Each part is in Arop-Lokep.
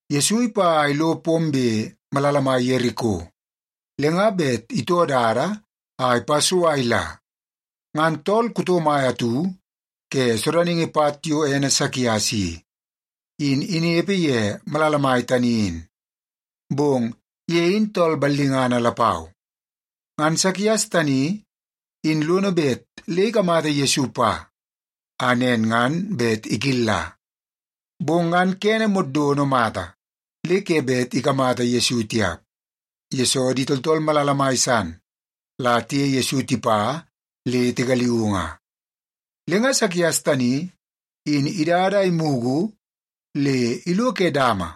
Yesu ipa a ilo pombe malala mai Yeriko, le nga bet itoo dada a ipa so a ila. Ngan tool kuto mai atu ke sodaningi pat yo ene Sakias i, in inepe ye malala mai tani in. Bong ye in tool ballingana lapau. Ngan Sakias tani in lono bet le ikamata Yesu pa, a nen ngan bet ikilla. Bong ngan kene moddono mata le ke bet ikamata Yesu tiap, yesoo di tooltool malala mai san la tiye Yesu tipa le tigaliuu nga. Le nga Sakias tani in idada a imugu le ilo ke dama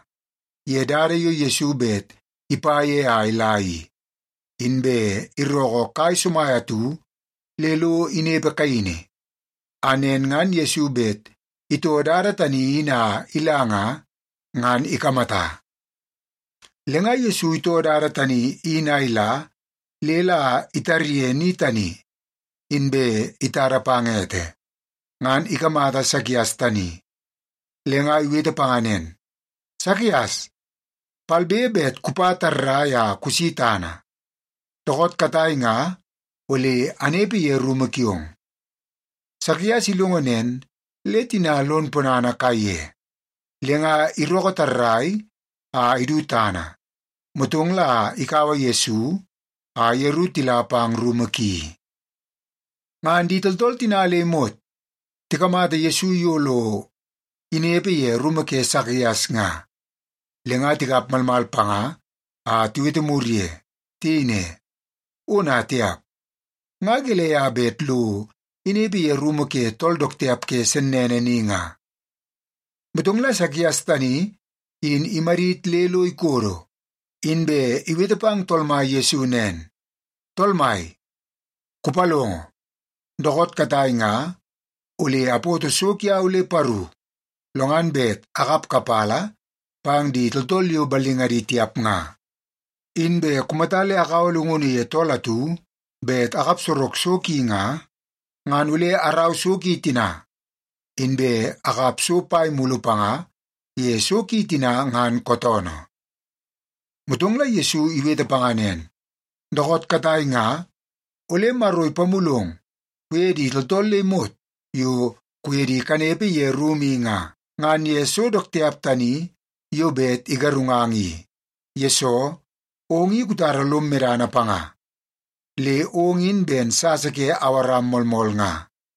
ye dada yo Yesu bet ipa ye a ila i, inbe irookoo kai somai atu le lo inepe kaini, a nen ngan Yesu bet itoo dada tani in a ila nga, ngan ikamata. Le nga Yesu itoo dada tani in a ila le la itarye ni tani, inbe itada pang ete, ngan ikamata Sakias tani, le nga iwete panga nen, “Sakias, palbe be kupa tarrai a kusi tana! Dookoot katai nga ole anepe ye rumu kiong.” Sakias ilongo nen, le tina lon ponana kaiye. Le nga irookoo tarrai a idu tana, motong la ikaua Yesu a yeru tila pang rumu ki. Ngan di tooltool tina le imot tikamata Yesu yo lo inepe ye rumu ke Sakias nga, le nga tikap malmal panga a tiwete mur ye. Tiyei ne, “Ona tiap! Nga gelei a bet lo inepe ye rumu ke tool dook tiap ke sennene ni nga?” Motong la Sakias tani in imadit le lo ikodo, inbe iwete pang Tool Mai Yesu nen, “Tool Mai, kupalongo! Dookoot katai nga ole apoto so kiau le paru, lo ngan bet akap kapala pang di tooltool yo ballingadi tiap nga. Inbe kumata le akaua llungunu ye tool atu bet akap sorok so ki nga, ngan ole araua so ki tina, inbe akap so pai mulu panga ye so ki tina ngan kootoonoo.” Motong la Yesu iwete panga nen, “Dookoot katai nga ole Maro ipamulong kuye di tooltool le imot yo kuye di kanepe ye rumu i nga, ngan ye so dook tiap tani yo bet igarungang i, yesoo ong i kutara lom medana panga, le ong i ben sasa ke Awaram moolmool nga.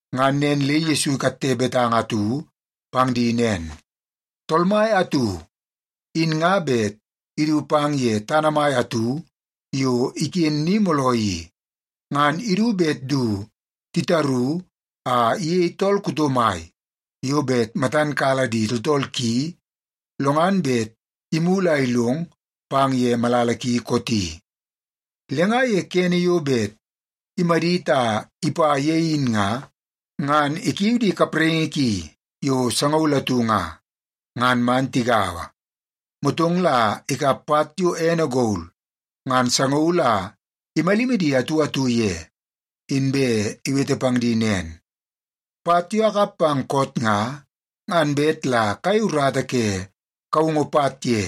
Ngan nen le Yesu ikatte betanga atu pang di nen, “Tool mai atu, in nga bet idu pang ye tana mai atu yo iken ni mooloo i, ngan idu bet du titaru a iyei tool kuto mai yo bet matan kala di tooltool ki, lo ngan bet imulu a ilong pang ye malala ki kooti. Le nga ye kene yo bet imadit a ipa ye in nga, ngan ikiu di kapraingi ki yo sangaul atu nga, ngan man tigaua. Motong la ikap pat yo ene gol ngan sangaul a imalimi di atu atu ye, inbe iwete pang di nen, ‘Pat yo akap pang koot nga, ngan bet la kayei urata ke kaungu pat ye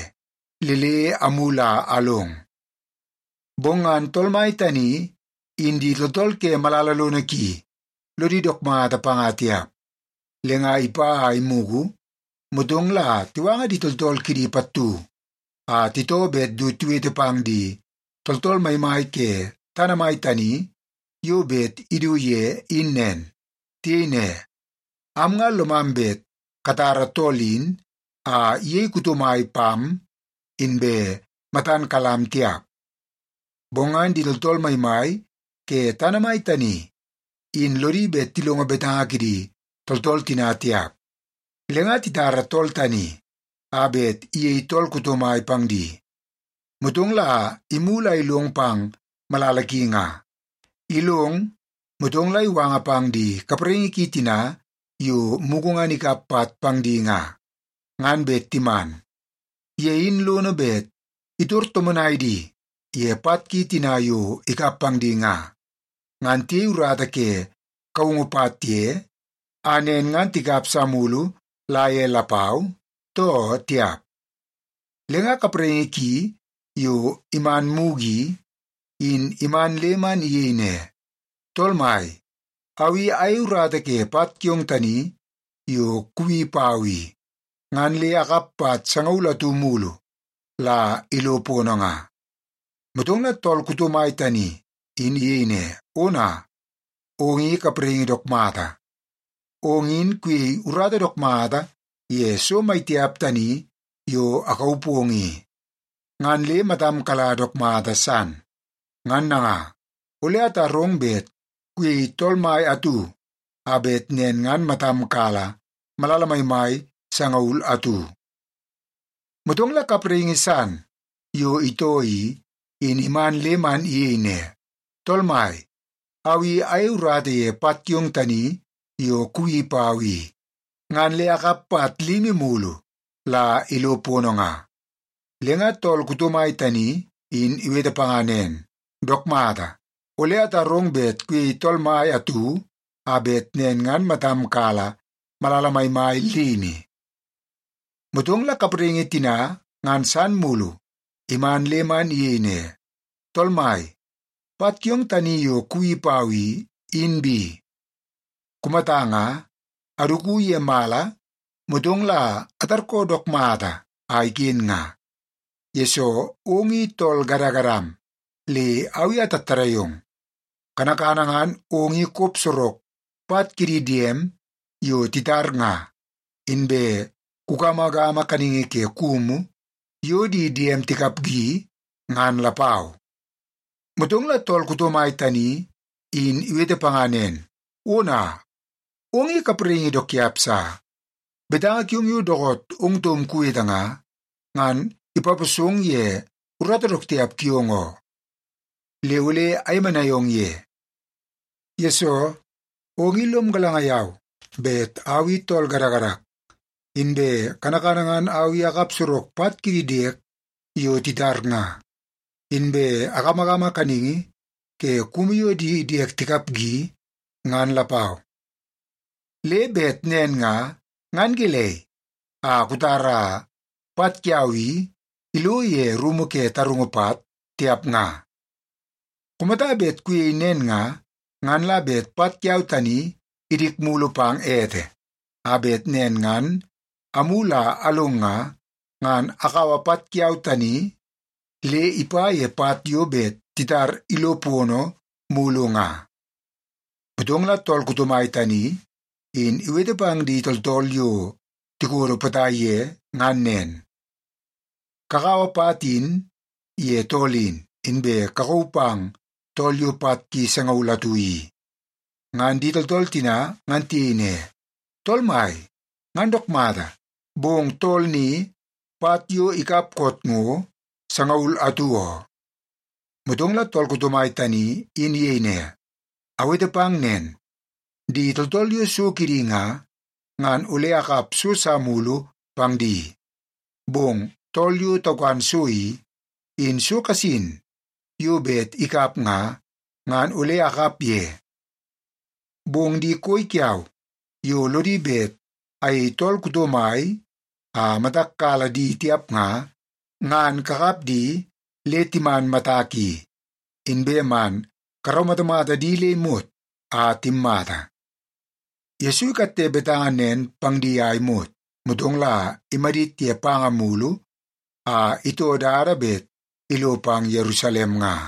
le le amulu a along.’ “Bong ngan tool mai tani in di tooltool ke malala lono ki, lodi dook mata panga tiap. Le nga ipa a imugu, motong la tiwanga di tooltool kidi pattu a titoo bet du tiwete pang di tooltool maimai ke tana mai tani yo bet idu ye in nen. Tiyei ne, ‘Am nga lomam bet katara tool in a iyei kuto mai pam, inbe matan kalam tiap.’ “Bong ngan di tooltool maimai ke tana mai tani in lodi bet tilongo betanga kidi tooltool tina tiap. Le nga titara tool tani a bet iyei tool kuto mai pang di, motong la imulu a ilong pang malala ki nga. Ilong, motong la iwanga pang di kapraingi ki tina yo mugu ngan ikap pat pang di nga, ngan bet timan. Ye in lono bet itor tomonai di ye pat ki tina yo ikap pang di nga, ngan tiyei urata ke kaungu pat ye, a nen ngan tikap sa mulu la ye lapau, too tiap? “Le nga kapraingi ki yo iman mugu i, in iman le man iyei ne, ‘Tool mai, au i ayei urata ye pat kiong tani yo kuwi pau i, ngan le akap pat sangaul atu mulu la ilo pono nga.’ “Motong la tool kuto mai tani in iyei ne, ‘Ona, ong i kapraingi dook mata! Ong in kuyei urata dook mata ye so maitiap tani yo akauu pong i, ngan le matam kala dook mata san. Ngan nanga, ole atarong bet kuyei tool mai atu a bet nen ngan matam kala malala maimai sangaul atu.’ “Motong la kapraingi san yo itoo i, in iman le man iyei ne, ‘Tool mai, au i ayei urata ye pat kiong tani yo kuwi pau i, ngan le akap pat limi mulu la ilo pono nga.’ “Le nga tool kuto mai tani in iwete panga nen, ‘Dook mata, ole atarong bet kuyei tool mai atu a bet nen ngan matam kala malala maimai limi.’ “Motong la kapraingi tina ngan san mulu iman le man iyei ne, ‘Tool mai, pat kiong tani yo kuwi pau i, in bi. Kumata nga, aduku ye mala, motong la atarkoo dook mata a iken nga, yesoo ong i tool gadagadam le au i atattadai ong. Kanakana ngan ong i kop sorok pat kidi diem yo titar nga, inbe kugamagama kaningi ke kumu yo di diem tikapgi, ngan lapau.’ “Motong la tool kuto mai tani in iwete panga nen, ‘Ona, ong i kapraingi dook tiap sa! Betanga kiong yo dookoot ong taum kuwete nga, ngan ipaposong ye urata dook tiap kiong oo. Le ole ayemenai ong ye. Yesoo, ong i lom galanga yau bet au i tool gadagadak, inbe kanakana ngan au i akap sorok pat kidi diek yo titar nga, inbe agamagama kaningi ke kumu yo di diek tikapgi, ngan lapau. Le bet nen nga, ngan gelei a kutara pat kiau i ilo ye rumu ke tarungu pat, tiap nga? Kumata bet kuyei nen nga, ngan la bet pat kiau tani idik mulu pang ete, a bet nen ngan amulu a along nga, ngan akaua pat kiau tani le ipa ye pat yo bet titar ilo pono mulu nga.’ “Motong la tool kuto mai tani in iwete pang di tooltool yo tikodo potai pang ye ngan nen, ‘Kakaua pat in ye tool in, inbe kakauu pang tool yo pat ki sangaul atu i.’ “Ngan di tooltool tina ngan tiyei ne, ‘Tool mai, ngan dook mata, bong tool ni pat yo ikap koot ngo sangaul atu oo!’ “Motong la tool kuto mai tani in iyei ne, ‘Awete pang nen, di tooltool yo so kidi nga, ngan ole akap so sa mulu pang di. Bong tool yo taukan so i, in so kasin yo bet ikap nga, ngan ole akap ye. Bong di koi kiau yo lodi bet ayei tool kuto mai a matak kala di tiap nga, ngan kakap di le timan matak i, inbe man karaumatamata di le imot a timmata.’” Yesu ikatte betanga nen pang di a imot, motong la imadit ye panga mulu a itoo dada bet ilo pang Yerusalem nga.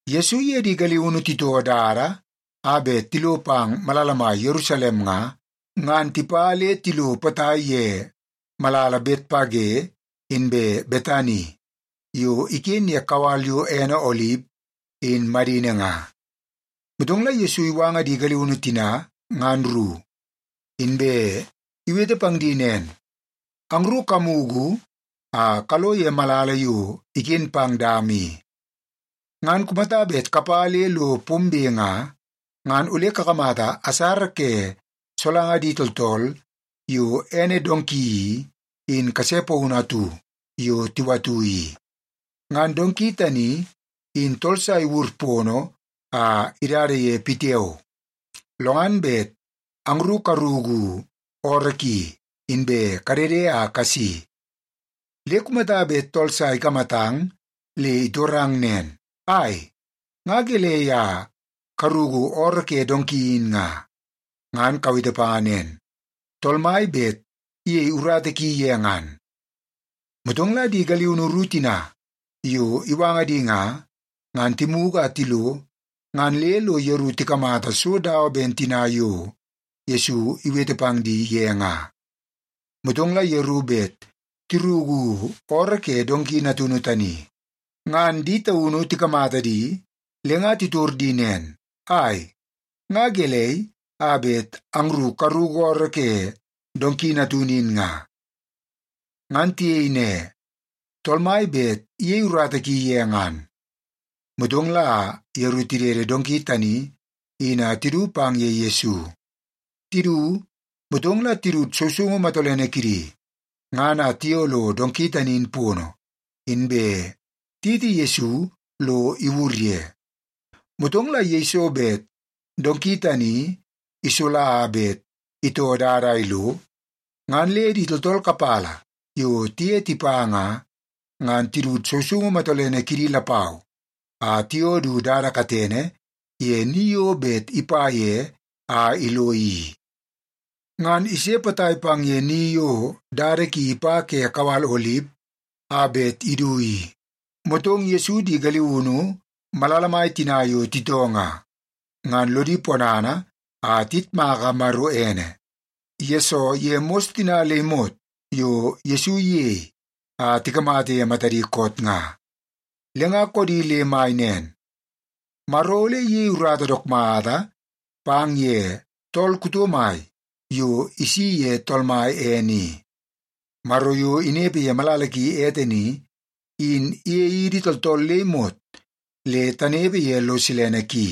Yesu iye di galiunu titoo dada a bet tilo pang malala mai Yerusalem nga, ngan tipa le tilo potai ye malala Betpage inbe Betani yo iken ye kawal yo ene Olip in madini nga. Motong la Yesu iwanga di galiunu tina ngan ru, inbe iwete pang di nen, “Angru kamugu a kalo ye malala yo iken pang dama i. Ngan kumata bet kapa le lo pombe nga, ngan ole kakamata asara ke solanga di tooltool yo ene donki i, in kase paunu atu yo tiwatu i. Ngan donki tani in tool sa iwur pono a idada ye pitiao. Lo ngan bet angru karuku ooroo ki, inbe kadede a kasi. Le kumata bet tool sa ikamatang le itorang nen, ‘Ai, nga gelei a karuku ooroo ke donki in nga?’ ngan kawete panga nen, ‘Tool Mai bet iyei urata ki ye ngan.’” Motong la di galiunu ru tina yo iwanga di nga, ngan timugu a tilo ngan le lo yeru tikamata so dawa ben tina yo Yesu iwete pang di ye nga. Motong la yeru bet tiruku ooroo ke donki natunu tani, ngan di taunu tikamata di le nga titor di nen, “Ai, nga gelei a bet angru karuku ooroo ke donki natunu in nga?” Ngan tiyei ne, “Tool Mai bet iyei urata ki ye ngan.” Motong la yeru tidede donki tani in a tidu pang ye Yesu. Tidu, motong la tidut sousoungu matolene kidi ngan a tiyoo lo donki tani in pono, inbe tiyiti Yesu lo iwur ye. Motong la yeiso bet donki tani isola a bet itoo dada a ilo, ngan le di tooltool kapala yo tiye tipa nga, ngan tidut sousoungu matolene kidi lapau a tiyoo du dada katene ye ni yo bet ipa ye a ilo i. Ngan ise potai pang ye ni yo dada ki ipa ke kawal Olip a bet idu i, motong Yesu di galiunu malala mai tina yo titoo nga, ngan lodi ponana a tiyitmaka Maro ene, yesoo ye mos tina le imot yo Yesu iyei a tikamata ye matadi koot nga. Le nga koodi le mai nen, “Maro ole iyei urata dook mata pang ye tool kuto mai yo isi ye Tool Mai ene i. Maro yo inepe ye malala ki ete ni, in iyei idi tooltool le imot le tanepe ye lo silene ki.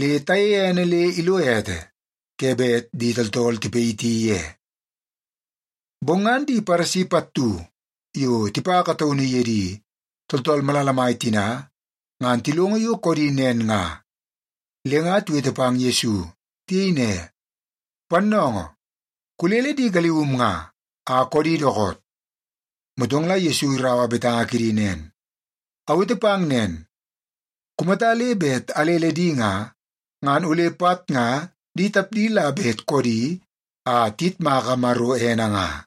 Le tayeie ene le ilo ete ke bet di tooltool tipayiti ye!” Bong ngan di Paresi pattu yo tipa kataunu ye di tooltool malala mai tina ngan tilongo yo koodi nen nga, le nga tiwete pang Yesu. Tiyei ne, “Pannoongoo, kulele di galium nga a koodi dookoot!” Motong la Yesu iraua betanga kidi nen, “Awete pang nen, kumata le bet alele di nga, ngan ole pat nga di tapdi la bet koodi a tiyitmaka Maro ene nga.”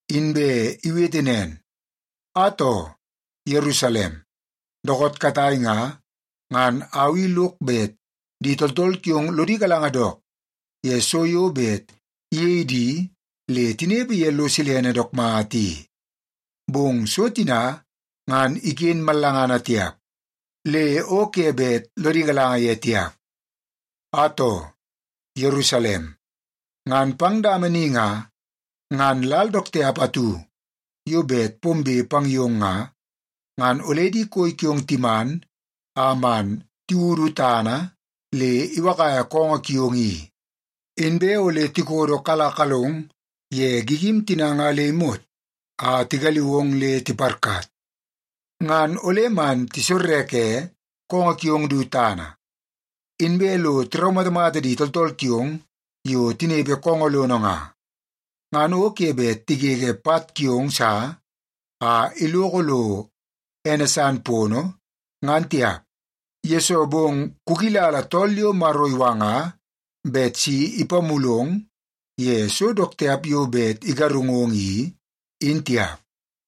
Inbe iwete nen, “Atoo, Yerusalem, dookoot katai nga, ngan au i lok bet di tooltool kiong lodi galanga dook ye so yo bet iyei di le tinepe ye lo silene dook mata i. Bong so tina ngan iken mallangana tiap, le o ke bet lodi galanga ye tiap. Atoo, Yerusalem, ngan pang dama ni nga, ngan lal dook tiap atu yo bet pombe pang yong nga, ngan ole di koi kiong timan a man tiwudu tana le iwakaia koongoo kiong i. Inbe ole tikodokalakalong ye gigim tina nga le imot a tigaliu ong le tiparkat. Ngan ole man tisorreke koongoo kiong du tana, inbe lo tiraumatamata di tooltool kiong yo tinepe koongoo lono nga. Ngan o ke bet tigege pat kiong sa a iloko lo ene san pono, ngan tiap, yesoo bong kukilala tool yo Maro iwanga bet isi ipamulong ye so dook tiap yo bet igarungong i, in tiap.”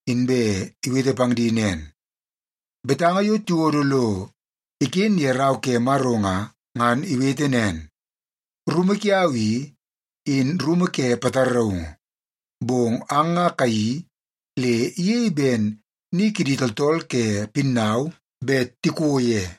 inbe iwete pang di nen, “Betanga yo tiwodo lo iken ye Rau ke Maro nga, ngan iwete nen, ‘Rumu kiau i, in rumu ke pataraungu.’ Bong ang nga kayeii le iyei ben ‘ni kidi tooltool ke pinnau bet tiko ye.’”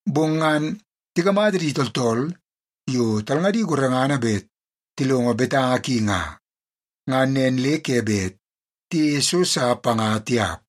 Bong ngan tikamata di tooltool yo talngadi gorengana bet tilongo betanga ki nga, ngan nen le ke bet tiyeie so sa panga tiap.